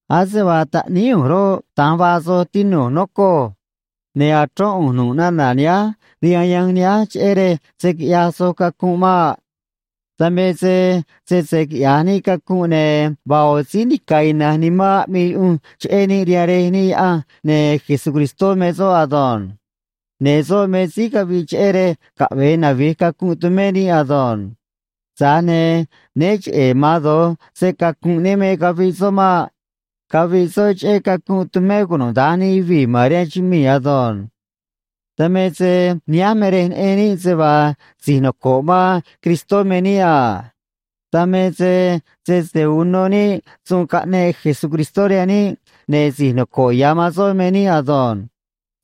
Ase vaa taꞌníí ꞌu̱nj roꞌ, da̱nj vaa soj, tinu̱j, nocoj. Ne̱ achrón ꞌu̱nj nu̱ꞌ nana̱ nihánj rihaan yanj nihánj, cheꞌé rej se̱ quiꞌyaj soj cacunꞌ maꞌ. Dan me se sese quiꞌya̱j níꞌ cacunꞌ, ne̱ vaa ꞌo̱ síí nica̱ ina̱nj nimán aꞌmii yuꞌunj cheꞌé níꞌ rihaan Rej níꞌ Yaꞌanj, ne̱ Jesucristó me soꞌ ado̱nj. Ne̱ soꞌ me síí caviꞌ cheꞌé rej caꞌve̱e navi̱j cacunꞌ tumé níꞌ ado̱nj. Tza̱j ne̱ né cheꞌe̱ ma̱an do̱j se‑cacu̱nꞌ níꞌ me caviꞌ soꞌ maꞌ. Caviꞌ soꞌ cheꞌé cacunꞌ tumé cunuda̱nj nij yuvii̱ ma̱n rihaan chumii̱ ado̱nj. Dan me se nihánj me rej neꞌen níꞌ se vaa si̱j noco̱ꞌ man Cristó me níꞌ a. Dan me se sese uno níꞌ suun caꞌneꞌ Jesucristó rihaan níꞌ, ne̱ si̱j noco̱ꞌ ya̱ man soꞌ me níꞌ ado̱nj.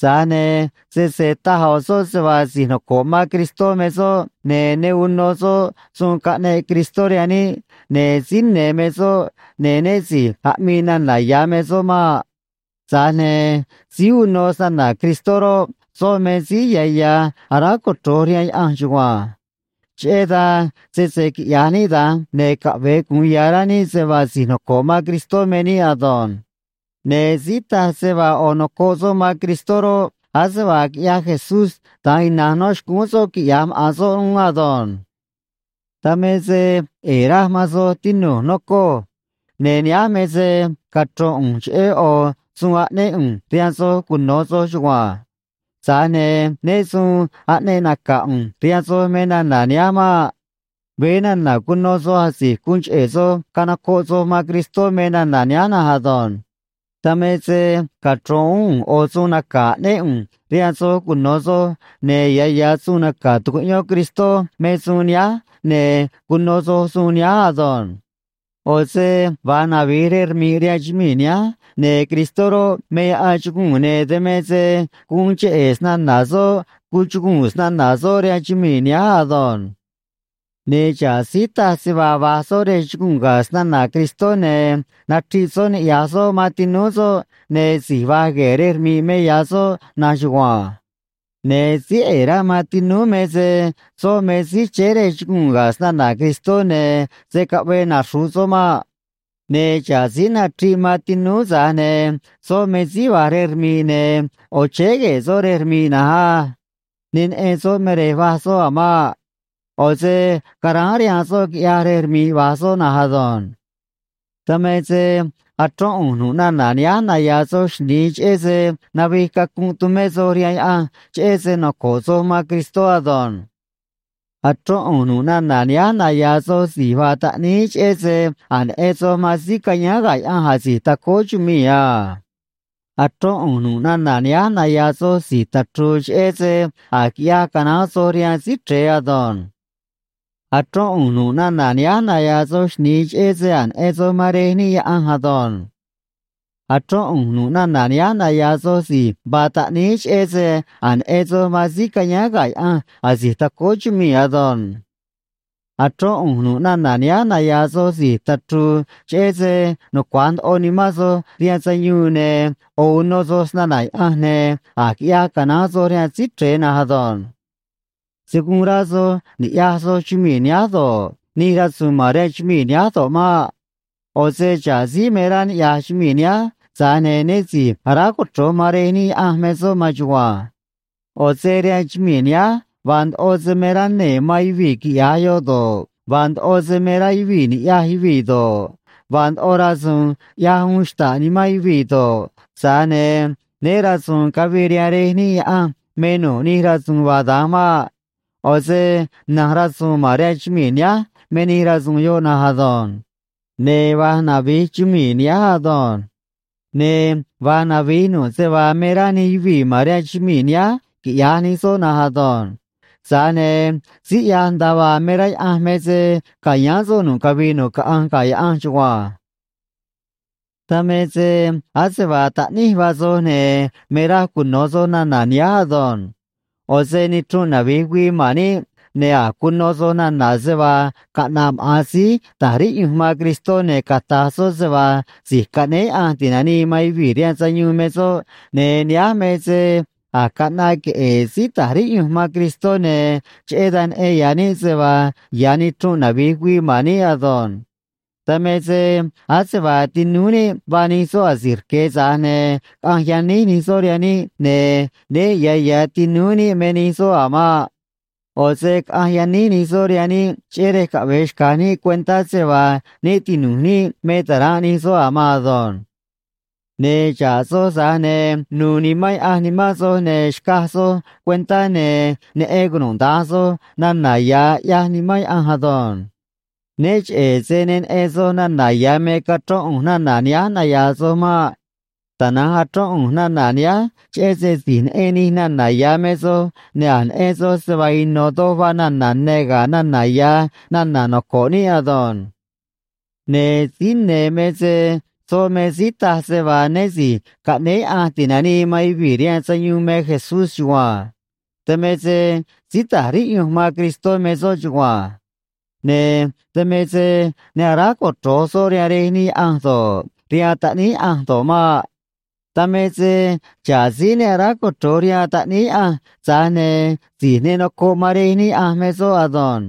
Tza̱j ne̱ sese taj ꞌo̱ soꞌ se vaa si̱j noco̱ꞌ man Cristó me soꞌ ne̱ ne uno soꞌ suun caꞌneꞌ Cristó rihaan níꞌ, ne̱ síí ne̱ me soꞌ, ne̱ né si̱j aꞌmii nana̱ ya̱ me soꞌ maꞌ. Tza̱j ne̱ síí uno snana̱ Cristó roꞌ, soꞌ me síí ya̱ ya̱ aráj cochro̱j rihaan Yaꞌanj chugua̱nj. Cheꞌé dan, sese quiꞌya̱j níꞌ da̱nj, ne̱ caꞌve̱e gu̱un ya̱ rá níꞌ se vaa si̱j noco̱ꞌ man Cristó me níꞌ ado̱nj. Ne̱ síí taj se vaa ꞌo̱ nocoꞌ soꞌ man Cristó roꞌ, ase vaa quiꞌyaj Jesús, da̱nj ina̱nj nó xcúún soꞌ quiꞌya̱j maꞌa̱n soꞌ uún ado̱nj. Dan me se ꞌe̱e̱ raj man soj, tinu̱j, nocoj. Ne̱ nihánj me se cachro̱n ꞌu̱nj cheꞌé ꞌo̱ suun aꞌnéꞌ ꞌu̱nj rihaan soj cuno̱ soj chugua̱nj. Tza̱j ne̱ né su̱u̱n aꞌneꞌ naca̱ ꞌu̱nj rihaan soj me nana̱ nihánj maꞌ. Veé nana̱ cuno soj asi̱j guun cheꞌe̱ soj canocoꞌ soj man Cristó me nana̱ nihánj na̱nj ado̱nj. Dan me se cachro̱n uún ꞌu̱nj ꞌo̱ suun naca̱ aꞌnéꞌ ꞌu̱nj rihaan soj cuno̱ soj, ne̱ ya̱ ya̱ suun naca̱ tucuꞌyón Cristó me suun nihánj, ne̱ cuno soj suun nihánj ado̱nj. ꞌO̱ se va̱j navi̱j rej rmi̱ꞌ rihaan chumii̱ nihánj, ne̱ Cristó roꞌ, me yaꞌan chuguu̱n, ne̱ dan me se guun cheꞌe̱ snana̱ soꞌ cuchuguu̱n snana̱ soꞌ rihaan chumii̱ nihánj ado̱nj. Ne̱ xa̱ꞌ síí taj se vaa va̱j soꞌ rej chuguu̱n ga̱ snana̱ Cristó ne̱ nachriꞌ soꞌ niꞌya̱j soꞌ man tinúú soꞌ, ne̱ si̱j va̱j gue̱e̱ rej rmi̱ꞌ me ya̱ soꞌ na̱nj chugua̱nj. Ne̱ síí ꞌe̱e̱ rá man tinúú me se soꞌ me síí chéé rej chuguu̱n ga̱ snana̱ Cristó, ne̱ se̱ caꞌvee naxru̱ꞌ soꞌ maꞌ. Ne̱ xa̱ꞌ síí nachriꞌ man tinúú, tza̱j ne̱ soꞌ me síí va̱j rej rmi̱ꞌ, ne̱ ꞌo̱ chéé gue̱e̱ soꞌ rej rmi̱ꞌ na̱nj á. Ne neꞌen soꞌ me rej va̱j soꞌ a̱ maꞌ. ꞌO̱ se caráán rihaan soꞌ, quiꞌyaj rej rmi̱ꞌ va̱j soꞌ na̱nj ado̱nj. Dan me se achrón ꞌu̱nj nu̱ꞌ nana̱ nihánj naya̱a̱ soj xni̱i, cheꞌé se navij cacunꞌ tumé soj rihaan Yaꞌanj cheꞌé se noco̱ꞌ soj man Cristó ado̱nj. Achrón ꞌu̱nj nu̱ꞌ nana̱ nihánj naya̱a̱ soj si̱j vaa taꞌníí, cheꞌé se a̱j neꞌen soj man síí cayáán ga̱ Yaꞌanj asi̱j tacóó chumii̱ a. Achrón ꞌu̱nj nu̱ꞌ nana̱ nihánj naya̱a̱ soj si̱j tachru̱u̱, cheꞌé se a̱j quiꞌyaj canaán soj rihaan Síí Chre̱e ado̱nj. Achrón ꞌu̱nj nu̱ꞌ nana̱ nihánj naya̱a̱ soj xni̱i, cheꞌé se a̱j neꞌen soj man Rej níꞌ Yaꞌanj ado̱nj. Achrón ꞌu̱nj nu̱ꞌ nana̱ nihánj naya̱a̱ soj si̱j vaa taꞌníí, cheꞌé se a̱j neꞌen soj man síí cayáán ga̱ Yaꞌanj asi̱j tacóó chumii̱ ado̱nj. Achrón ꞌu̱nj nu̱ꞌ nana̱ nihánj naya̱a̱ soj si̱j tachru̱u̱, cheꞌé se nucua̱j ndoꞌo nimán soj rihaan sayuun, ne̱ ꞌo̱ uno soj snana̱ Yaꞌanj, ne̱ a̱j quiꞌyaj canaán soj rihaan Síí Chre̱e na̱nj ado̱nj. Se̱ guun rá soj ni̱ꞌyaj soj chumii̱ nihánj do̱ꞌ, nij rasu̱u̱n ma̱n rihaan chumii̱ nihánj do̱ꞌ maꞌ. ꞌO̱ se xa̱ꞌ síí me rá niꞌya̱j chumii̱ nihánj, tza̱j ne̱ né si̱j aráj cochro̱j man Rej níꞌ Yaꞌanj me soꞌ maan chugua̱nj. ꞌO̱ se rihaan chumii̱ nihánj vaa ndoꞌo se me rá nee̱ man yuvii̱ quiꞌya̱j yoꞌ do̱ꞌ, vaa ndoꞌo se me rá yuvii̱ ni̱ꞌyaj yuvii̱ do̱ꞌ, vaa ndoꞌo rasu̱u̱n ꞌyaj uun xta̱ꞌ nimán yuvii̱ do̱ꞌ, tza̱j ne̱ né ra̱su̱u̱n cavii rihaan Rej níꞌ Yaꞌanj me nu̱ꞌ nij rasu̱u̱n vaa da̱nj maꞌ. ꞌO̱ se na̱nj rasu̱u̱n ma̱n rihaan chumii̱ nihánj me nij rasu̱u̱n yoꞌ na̱nj ado̱nj. Ne̱ va̱j navi̱j chumii̱ nihánj ado̱nj. Ne̱ va̱j navi̱j nu̱ꞌ se vaa me rá nij yuvii̱ ma̱n rihaan chumii̱ nihánj quiꞌya̱j nij soꞌ na̱nj ado̱nj. Tza̱j ne̱ síí ꞌyaj nda̱a vaa me rá Yaꞌanj me se ca̱yáán soꞌ nu̱ꞌ cavii nu̱ꞌ caꞌanj ga̱ Yaꞌanj chugua̱nj. Dan me se ase vaa taꞌníj vaa soj, ne̱ me raj cuno̱ soj nana̱ nihánj ado̱nj. ꞌO̱ se nichrunꞌ navi̱j güii man níꞌ, ne̱ a̱j cuno soj nana̱ se vaa caꞌna̱ꞌ maꞌa̱n síí ta̱j riꞌyunj man Cristó, ne̱ cata̱j soꞌ se vaa Si̱j Caꞌnéé Yaꞌanj Ti̱nanii man Yuvii̱ rihaan Sayuun me soꞌ, ne̱ nihánj me se a̱j caꞌnaꞌ queꞌe̱e̱ síí ta̱j riꞌyunj man Cristó, ne̱ cheꞌé dan neꞌen ya̱ níꞌ se vaa ya̱ nichrunꞌ navi̱j güii man níꞌ ado̱nj. Dan me se ase vaa tinúú níꞌ vaa nij soꞌ asi̱j rque̱, tza̱j ne̱ caꞌanj yaníj nij soꞌ rihaan níꞌ, ne̱ né ya̱ ya̱ tinu̱j níꞌ me nij soꞌ a̱ maꞌ. ꞌO̱ se caꞌanj yaníj nij soꞌ rihaan níꞌ cheꞌé rej caꞌve̱e xca̱j níꞌ cuentá se vaa né tinu̱j níꞌ me ta̱ranꞌ nij soꞌ a̱ maan ado̱nj. Ne̱ xa̱ꞌ soj, tza̱j ne̱ nu̱u̱ Nimán Yaꞌanj nimán soj, ne̱ xcaj soj cuentá ne̱ neꞌen cunuda̱nj soj nana̱ ya̱ ꞌyaj Nimán Yaꞌanj ado̱nj. Né cheꞌe̱ se ne neꞌen soj nana̱ ya̱ me cachrón ꞌu̱nj nana̱ nihánj naya̱a̱ soj maꞌ. Tana̱nj achrón ꞌu̱nj nana̱ nihánj cheꞌé se si̱j neꞌen nij nana̱ ya̱ me soj, ne̱ a̱j neꞌen soj se vaa ino̱ doj vaa nana̱ ne̱ ga̱ nana̱ ya̱ nana̱ noco̱ꞌ níꞌ ado̱nj. Ne̱ síí ne̱ me se soꞌ me síí taj se vaa né Si̱j Caꞌnéé Yaꞌanj Ti̱nanii man Yuvii̱ rihaan Sayuun me Jesús chugua̱nj. Dan me se síí ta̱j riꞌyunj man Cristó me soꞌ chugua̱nj. Ne̱ dan me se ne aráj cochro̱j soꞌ rihaan Rej níꞌ Yaꞌanj do̱ꞌ, rihaan Taꞌníí Yaꞌanj do̱ꞌ maꞌ. Dan me se xa̱ꞌ síí ne aráj cochro̱j rihaan Taꞌníí Yaꞌanj, tza̱j ne̱ si̱j ne nocoꞌ man Rej níꞌ Yaꞌanj me soꞌ ado̱nj.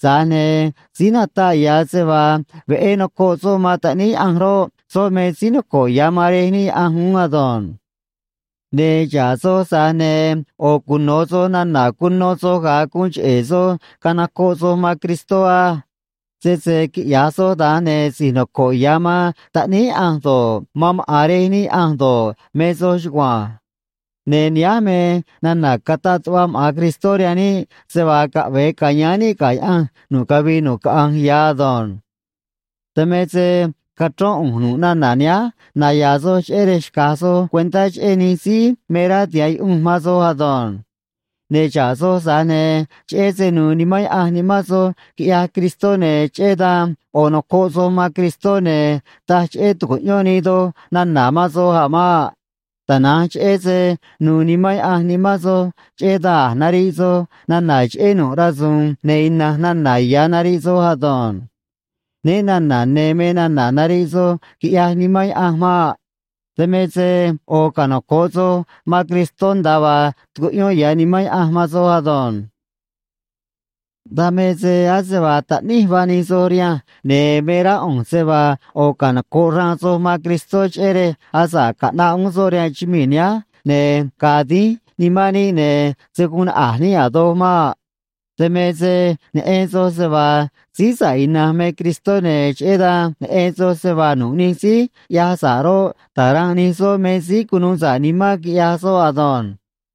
Tza̱j ne̱ síí nataꞌ ya̱ se vaa veꞌé nocoꞌ soꞌ man Taꞌníí Yaꞌanj roꞌ, soꞌ me síí noco̱ꞌ ya̱ man Rej níꞌ Yaꞌanj uún ado̱nj. Ne̱ xa̱ꞌ soj, tza̱j ne̱ ꞌo̱ cuno̱ soj nana̱ cuno soj ga̱a guun cheꞌe̱ soj canocoꞌ soj man Cristó á. Sese quiꞌya̱j soj da̱nj, ne̱ si̱j noco̱ꞌ ya̱ man Taꞌníí Yaꞌanj do̱ꞌ, man maꞌa̱n Rej níꞌ Yaꞌanj do̱ꞌ, me soj chugua̱nj. Ne̱ nihánj me nana̱ cataꞌ tuꞌva maꞌa̱n Cristó rihaan níꞌ, se vaa caꞌve̱e ca̱yáán níꞌ ga̱ Yaꞌanj nu̱ꞌ cavii nu̱ꞌ caꞌanj ya̱ ado̱nj. Dan me se cachrón ꞌu̱nj nu̱ꞌ nana̱ nihánj naya̱a̱ soj cheꞌé rej xca̱j soj cuentá cheꞌé nij síí me rá tiha̱ꞌ yuꞌunj man soj ado̱nj. Ne̱ xa̱ꞌ soj, tza̱j ne̱ cheꞌé se nu̱u̱ Nimán Yaꞌanj nimán soj quiꞌyaj Cristó, ne̱ cheꞌé dan ꞌo̱ nocoꞌ soj man Cristó, ne̱ taj cheꞌé tu̱cuꞌyón nii doj nana̱ man soj a̱ maꞌ. Tana̱nj cheꞌé se nu̱u̱ Nimán Yaꞌanj nimán soj, cheꞌé dan a̱j nariꞌ soj nana̱ cheꞌé nu̱ꞌ rasu̱u̱n, ne̱ ina̱nj nana̱ ya̱ nariꞌ soj ado̱nj. Né na̱na̱ ne̱ me nana̱ nariꞌ soj, quiꞌyaj Nimán Yaꞌanj maꞌ. Dan me se ꞌo̱ canoco̱ꞌ soj man Cristó, nda̱a vaa tucuꞌyón ya̱ Nimán Yaꞌanj man soj ado̱nj. Dan me se ase vaa taꞌníj vaa nij soj rihanj, ne̱ me rá ꞌu̱nj se vaa ꞌo̱ canoco̱ꞌ xraan soj man Cristó, cheꞌé rej asa̱ꞌ caꞌnaꞌ uún soꞌ rihaan chumii̱ nihánj, ne̱ ga̱a̱ dínj nimán níꞌ, ne̱ se̱ guun naꞌa̱j níꞌ a̱ doj maꞌ. Dan me se neꞌen soj se vaa síí sa̱ꞌ ina̱nj me Cristó, ne̱ cheꞌé dan neꞌen soj se vaa nu̱ꞌ nij síí ꞌyaj sa̱ꞌ roꞌ, ta̱ranꞌ nij soꞌ me síí cunuu sa̱ꞌ nimán quiꞌyaj soꞌ ado̱nj.